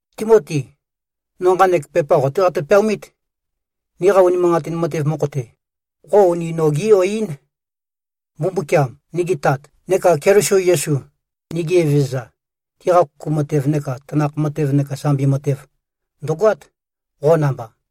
Timoti! No nqanek pepa qo-té qatø-peaomít. Niqa unimanqatin matev mokho-te, qo uni nogé-yo-ín. Mbumbukiam, nigi Tat, neka Keliso Yesu, nigi Evezøza, tiqa kuku matev neka tanakh matev neka sambi matev, ndø̀goát, qo namba.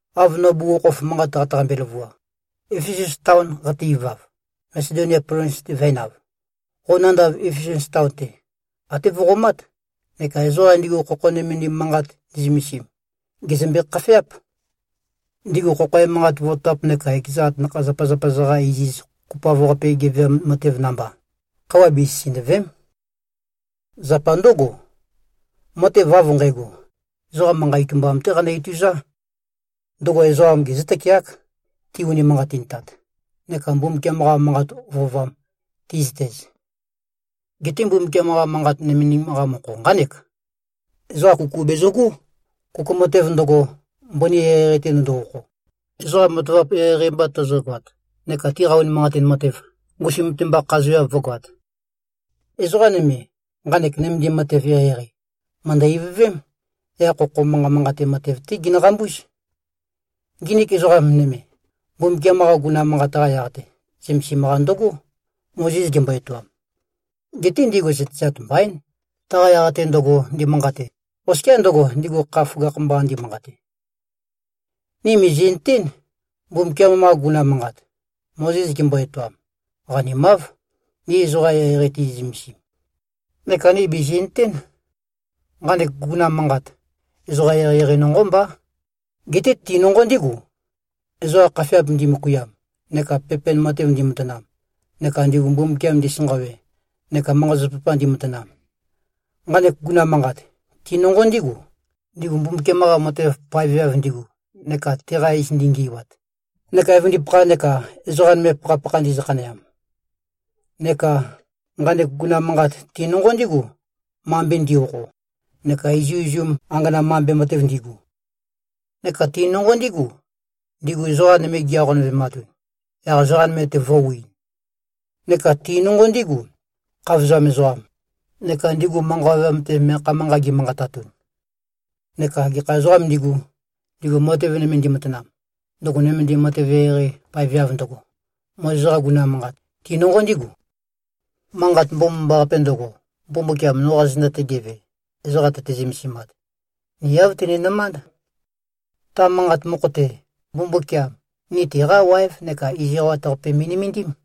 Av no bugukhokhof manqat qataqambe-løvua, Efesus taon qate-ivav, Masedonia plovins-te vø̄enav, qo nandav Efesus taon-te, até vøqomát, neka ezoqam ndigu khokho nømendim manqat ndi꞉zømesim, gèzømbe-khafeáp. Ndigu khokho emanqat vototap neka ekeza atanakha-zapazapa-za-qa iziz kopoav-qape geveam matev namba, khøuwa besisindø̀ve᷄m. Zapa ndǿgo, matev av nqægo, ezoqa manqa itumbam-té qanø-ituzá. Ndøgo ezoqa gezǿ-tøkeák, ti-unimanqatintat neka Mbumbukiam-qa manqa vøovam ti꞉zøtez. Geté Mbumbukiam-qa Manqat nømendim-qa mokho nqánek: Ezoqa kuku bezøgó, kuku matev ndøgo, mbøni eqeieqei-te ndøndo-okho, ezoqa matavap eqeieqei mba tøzøgoat neka tiqa unimanqatin matev, ngusum-te mba khazeav vǿgoāt. Ezoqa nøme, nqanek nømendim matev eqeieqei, mø̀ndø-ivøvém, yaq khokho manqa manqate matev-té ginøqambúz. Nginik ezoqa nøme, Mbumbukiam-qa guguna manqat-qa yaq-te zømesim-qa ndøgó, Mozes gembo-etoam. Geté ndigu zøtezat mbaín, taqa yaq-te ndøgo, ndi꞉manqate, oskiá ndøgo, ndigu kha føgakh-mba ndimanqate. Ni mìzi꞉nøtén, Mbumbukiam-qa guguna manqat, Mozes gembo-etoam, qanimáv, ni ezoqa eqeieqei tizi꞉-zømesim. Neka ni bìzi꞉nøtén. Nqanek guguna manqat, ezoqa eqeieqei nonqó mbá. Geté ti nonqo ndígu, ezoqa khafeap ndimøkuiam neka pepen matev ndimatanam, neka ndigu Mbumbukiam ndisanqawe neka manqa-zapazapa ndimatanam. Nqanek guguna manqat, ti nonqo ndígu, ndigu Mbumbukiam-qa matev paeveav ndigu neka teqa iz ndingi꞉wat, neka evøndipakha neka ezoqa nøme pakhapakha ndizø-khaneam. Neka nqanek guguna manqat ti nonqo ndígu, mambe ndi꞉-okho, neka izuizum angana mambe matev ndigu. Neka ti nonqo ndígu, ndigu ezoqa nøme gi-aqonøvematun, yaq ezoqa nøme-te vø̄wiin. Neka ti nonqo ndígu, khavozam ezoqam, neka ndigu manqa ovøyam-te meakha manqat gimanqatatun. Neka gekha ezoqām ndigu, ndigu matev nøme ndimatanam, ndøgo nømendim matev eqeieqei paeveav ndøgo, Mozes-qa guguna manqat, ti nonqo ndígu. Manqat Mbomambaqape ndøgo, Mbumbukiam noqa zenda-te geve, ezoqa tøte-zømesimat, ni āv tøninømánd. Ta manqat mokho-te, Mbumbukiam ni teqá waev neka iz eqawat-qape me꞉nømendím.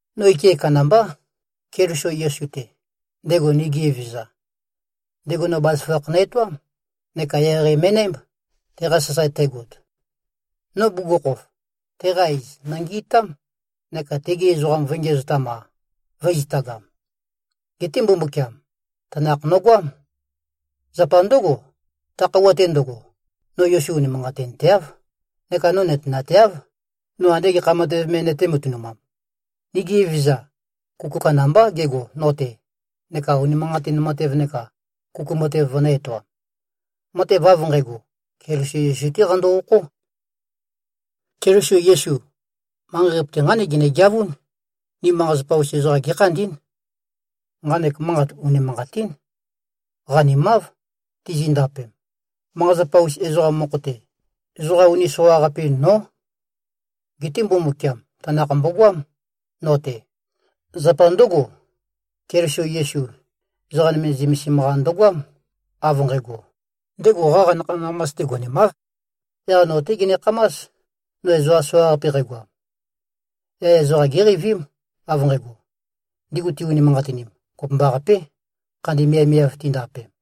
No ike kandambá, Keliso Yesu-te, ndego nigi Evezøza. Ndego no bazaføgakh nø-etoám neka eqeieqei me꞉nǽmb, teqa sasae tægot. No bugukhokhof, teqa iz nòngi꞉tám, neka tegi ezoqam vø̄e-ngiæzotam-a, vø̄e-zitagam. Geté Mbumbukiam tanakh nøgoám. Zapa ndǿgo, ta khøuwa-te ndøgo, no Yesu unimanqatinteáv, neka no nøtenateáv, no ande gekha matev me nøtē-matønumam. Nigi Evezøza, kuku kandambá gego no-te neka unimanqatin matev neka kuku matev vønø̄-etoam. Matev av nqægo, Keliso Yesu-té qando-okhó. Keliso Yesu, manqei-qape-te, nqánek genegeavún, ni manqa-zapa-us ezoqam gékhandí꞉n. Nqanek manqat unimanqatín. Qanimáv, tizindapem. Manqa-zapa-us ezoqam mokho-te, ezoqa uni soqaqape-in nó. Geté Mbumbukiam tanakh mbogoám, no-te. Zapa ndǿgo, Keliso Yesu, ezoqa nøme zømesim-qa ndøgoám, av nqægo, ndego qaqa nakha-nakhamas-te gonemáv. Yaq no-té genekhamás, no ezoqa soqaqape qægoam. Yaq ezoqa géqeivím, av nqægo, ndigu ti-unimanqatinim, kopømbaqapé, khandi miavmiav tindapem.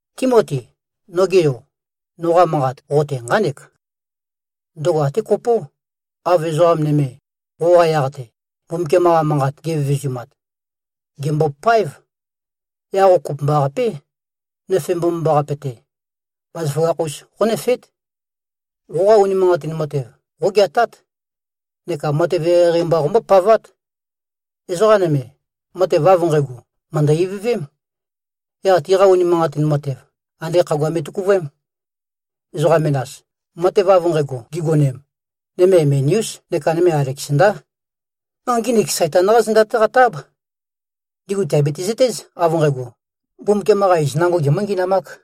Timoti, noge yo, noqa manqat qo-te nqánek. Ndøgo até kopó, av ezoqa nøme, qoqa yaq-te, Mbumbukiam-qa manqat givevezumat. Gèmbopáev. Yaq qo kopømbaqapé, nøfe mbomambaqape-te, bazaføgakh-us qónøfeét. Qoqa unimanqatin matev, qógeatát neka matev eqeieqei mba qombópavát. Ezoqa nøme, matev av nqægo, mø̀ndø-ivøvém. Yaq tiqa unimanqatin matev, ande khagua me vø̄tøkuvøem. Ezoqa menas, matev av nqægo gigonem, nøme Imenæús neka nøme Aleksandá. No nginik Saitan-qá zenda-té qatø-áb. Ndigu tìabiti-zøtéz, av nqægo: Mbumbukiam-qa iz nango gimø̄-ngi꞉namāk.